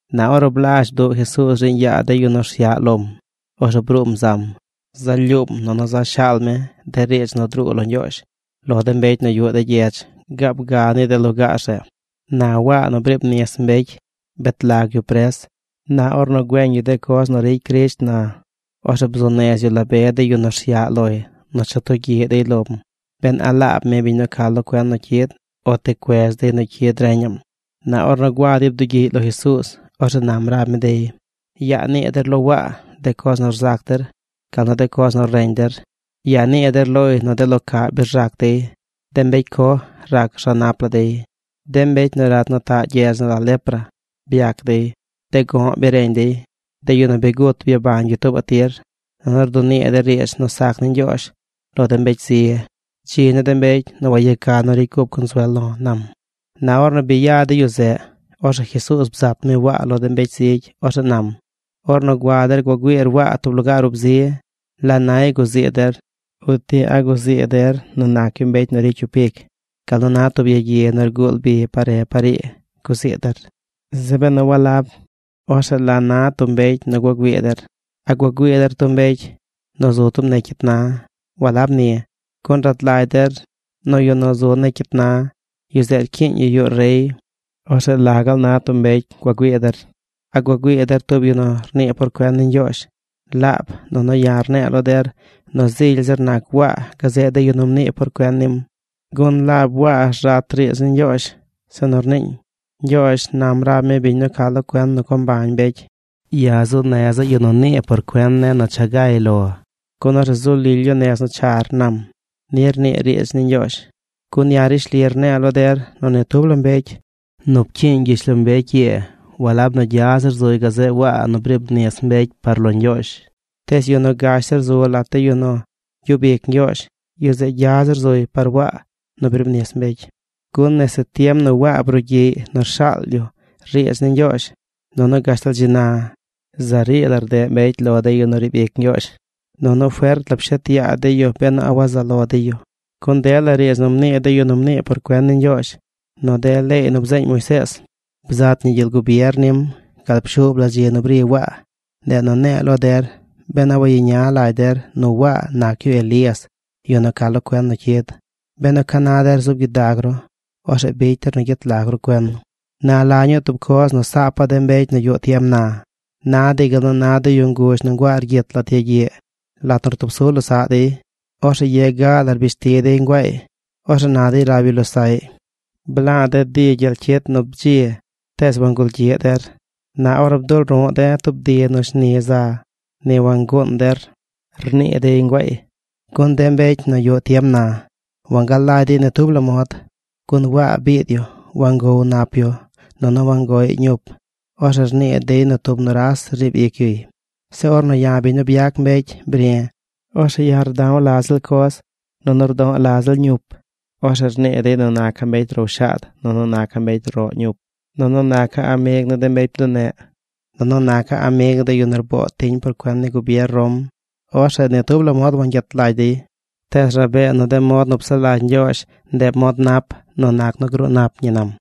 Na ornu blazh bduꞌ Jesuuz riiñ yaa de yu nu rsyaꞌ lom, orzeꞌ bruum zam. Za lyuum nunu za shaal mi de riidz nu druu lo Ñgyoozh lo de mbecy nu yuꞌ de gyedz gaab ga ni de lugaar zeꞌ. Na Waa nu briib nis mbecy bet lag yu pres. Na ornu güeñ yu de coz nu ricy Crisht na, orzeꞌ bzuu nez yu la be de yu nu rsyaꞌ loy nu cha tugyiꞌ dey lom, ben a laab mi biñ nu ca lo cuen nu cyid, o ti cuez dey nu cyid reñaꞌm. Na ornu gua dey bdugyiꞌy lo Jesuuz, orzeꞌ nam rab mi dey: ―Yaa nii der lo Waa de coz nu rzac der gal nu de coz nu reñ der. Yaa nii der loy nu de lo caꞌ bi rzac dey; de mbecy coj rac rza nap la dey; de mbecy nu rat nu taꞌ gyedz nu la lepra byac dey; de go̱ꞌ bi reñ dey; de yu nu bi gut byabañ yu tuubaꞌ tir; nunu rdunii de riidz nu sac ni Ñgyoozh lo de mbecy zi. Dzi ni de mbecy nu wayeca nu ricy cup consuel lo̱ ―nam. Na ornu bi ya de yu zeꞌ, orzeꞌ Jesuuz bzat mi Waa lo de mbecy zigy. Orzeꞌ nam: ―Ornu gua der gua güiir Waa tub lugaar ub zi, ¿la nay guzii der? ¿Uti a guzii der nu nac yu mbecy nu ricy cyup ic gal nu na tub yagyi nu rguul bi par re par ii guzii der? Zeꞌ benu walab, orzeꞌ ¿la na tub mbecy nu gua güii der? ¿A gua güii der tub mbecy nu zu tub negy cyit na? Walab ni, gun rad lagy der nu yu nu zu negy cyit na, yu zeꞌ rcyiiñ yu yuꞌ rey. ¿Orzeꞌ la gaal na tub mbecy gua güii der? ¿A gua güii der tub yu nu rnii por cuen ni Ñgyoozh? Laab, nunu ya̱ rne̱e̱ lo der nu zily zir nac Waa gazeꞌ de yu nu mnii por cuen nim. Gun laab Waa rzat riidz ni Ñgyoozh zeꞌ nu rniiñ: Ñgyoozh nam rab mi biñ nu ca lo cuen nu co mbañ mbecy: “Ya̱ zuu neza̱ yu nu nii por cuen ne̱ nu cha gay lor, gun orzeꞌ zu lily yu nez nu char”, nam. Ni rnii riidz ni Ñgyoozh. ’Gun ya̱ rishli rne̱e̱ lo der nu ni tub la mbecy nu pcyiiñ gyishlombecy ii a̱ꞌ zily zir nac yu gazeꞌ Waa nu briib nis mbecy par lo Ñgyoozh. Tees yu nu gash zir zu lat de yu nu gyub ic Ñgyoozh, yu zeꞌ gya zir zuy par Waa nu briib nis mbecy. ’Gun nese tiem nu Waa brugyiꞌy nu rshaal yu riidz ni Ñgyoozh, nunu gashtal dzi na, za rii la rdeꞌ mbecy lo de yu nu riib ic Ñgyoozh. Nunu fert la pshet yaa dey yu ben a wazaꞌ lo dey yu. Gun dela riidz nu mnii de yu nu mnii por cuen ni Ñgyoozh nu de leey nu bzeeñ Moisees bzat ñi gyel gubier nim gal pshuub la dzi nu bri Waa. Ndeꞌ nu ne̱e̱ lo der ben a wayeña lagy der nu Waa nac yu Elías, yu nu ca lo cuen nu cyid. Benu ca na der zub gyidag ru, orzeꞌ bicy der nu gyet lag ru cuen. ’Na, ¿la ñuu tub coz nu saapa̱ de mbecy nu yuꞌ tiem na? Na dey gal nu na de yu nguzh nu nguaa rgyit lat yagyiꞌ. Lat nu rtub su losaꞌ dey, orzeꞌ ye ga la rbish ti dey nguaay, orzeꞌ na dey rab yu losaꞌy: “Bla̱a̱ de̱ di gyel cyit nu bdzi, tees wangul gyiꞌ der. Na ornu bdul ru̱ꞌ de̱ tub di nu shni za, ni wanguun der”, rnii dey nguaay. Gun de mbecy nu yuꞌ tiem na wangalagy dey ni tub la mod. Gun Waa biid yu. Wangoow nap yu nunu wangoꞌy ñup. Orzeꞌ rnii dey nu tub nuras riib ic yuy. Zeꞌ ornu ya̱, biñ nu byac mbecy, bri̱, orzeꞌ ya̱ rda̱w la ziꞌl coz nunu rdo̱ꞌ la ziꞌl ñup. Orzeꞌ rnii dey nu naca̱ mbecy row shaad nunu mbecy roꞌ ñup, nunu naca̱ amig ni de mbecy bduneꞌ nunu naca̱ amig ni de yu nu rboo tiñ por cuen ni gubier Rom. Orzeꞌ ni tub la mod wangyet lagy dey. Tees rabee nu de mod nu psaꞌ lagy Ñgyoozh ndeꞌ mod nap nu nac nu gruu nap ñi ―nam.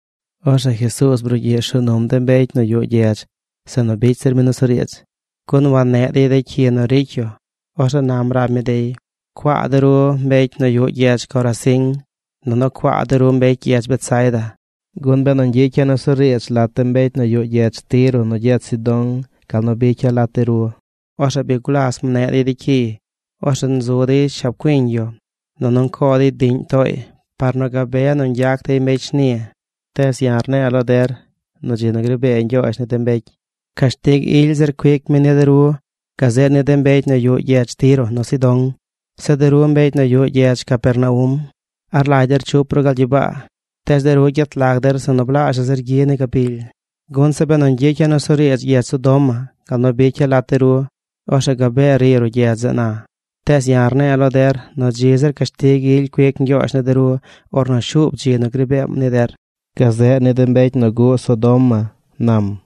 Orzeꞌ Jesuuz brugyiꞌ rshuu num de mbecy nu yuꞌ gyedz zeꞌ nu bicy zir mi nusuriidz, gun wanneꞌ dey de cyi nu ricy yu. Orzeꞌ nam rab mi dey: ―¡Cuaa de ru mbecy nu yuꞌ gyedz Corazín! Nunu, ¡cuaa de ru mbecy gyedz Betsaida! Gun benu ñgyicya̱ nusuriidz lat de mbecy nu yuꞌ gyedz Tiro nu gyedz Sidón gal nu bicya̱ lat de ru, orzeꞌ bi gulas nneꞌ dey cyiy. Orzeꞌ nzu dey shab cuiñ yu nunu ncoo dey diꞌñ tooy par nu gabe nu ñgyac dey mbecy shni. Tees ya̱ rne̱e̱ lo der nu dzi nu gri bee Ñgyoozh ni de mbecy, cashtig ily zir cuic mi ni de ru gazeꞌ ni de mbecy nu yuꞌ gyedz Tiro nu Sidón. Zeꞌ de ru mbecy nu yuꞌ gyedz Capernaum, ¿a rlagy der chup ru gal gyibaa? Tees de ru gyet lag der zeꞌ nu blaazhaꞌ zir gyi ni gabily. Gun zeꞌ benu ñgyicya̱ nusuriidz gyedz Sodoma gal nu bicya̱ lat de ru, orzeꞌ gabee ri ruꞌ gyedz zeꞌ na. Tees ya̱ rne̱e̱ lo der nu dzi zir cashtig ily cuic Ñgyoozh ni de ru ornu shuub dzi nu gri beem ni der, gazeꞌ ni de mbecy nu guꞌ Sodoma ―nam.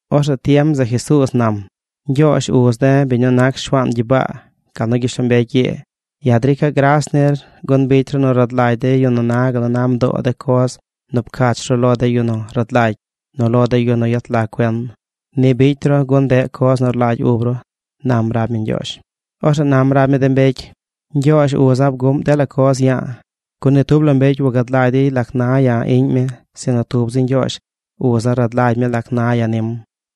Orzeꞌ tiem zeꞌ Jesuuz nam: ―Ñgyoozh, uz de̱, biñ nu nac Shuaan gyibaa gal nu gyishlombecy ii, ya̱ drica̱ gras nir gun bicy ru nu rad lagy de yu nu na gal nu na mdoo de coz nu pcach ru lo de yu nu rad lagy nu lo de yu nu yet lag cuen. Ni bicy ru gun ndeꞌ coz nu rlagy ub ru ―nam rab mi Ñgyoozh. Orzeꞌ nam rab mi de mbecy: ―Ñgyoozh, uza̱, bguꞌm dela coz ya̱a̱, gun ni tub la mbecy wagad lagy dey lac na ya̱, iꞌñ mi sinu tub zi Ñgyoozh, uza̱ rad lagy mi lac na ya̱ nim.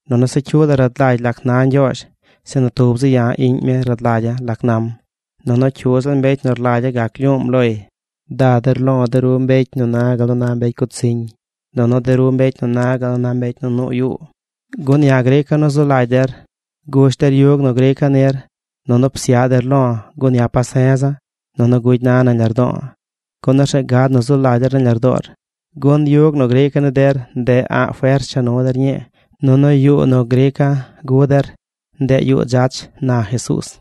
Nunu se cyu la rad lagy lac na Ñgyoozh. Sinu tub zi ya̱, iꞌñ mi rad lagya̱ lac nam. Nunu cyu ziꞌl mbecy nu rlagya̱ gac lyuum loy. Da der lo̱, de ru mbecy nu na gal nu na mbecy gutsiñ nunu de ru mbecy nu na gal nu na mbecy nu nuu yuu, gun ya̱ grica̱ nu zu lagy der. Gush der yug nu grica̱ nir nunu psyaꞌ der lo̱ gun ya̱ pase̱za̱ nunu gugy na̱ nañ lardo̱o̱, gun orzeꞌ gad nu zu lagy der nañ lardoor. Gun yug nu grica̱ ni der ndeꞌ a̱ꞌ fers cha nu der ñii nunu yuu nu grica̱ gu der, ndeꞌ yuu dzach ―na Jesuuz.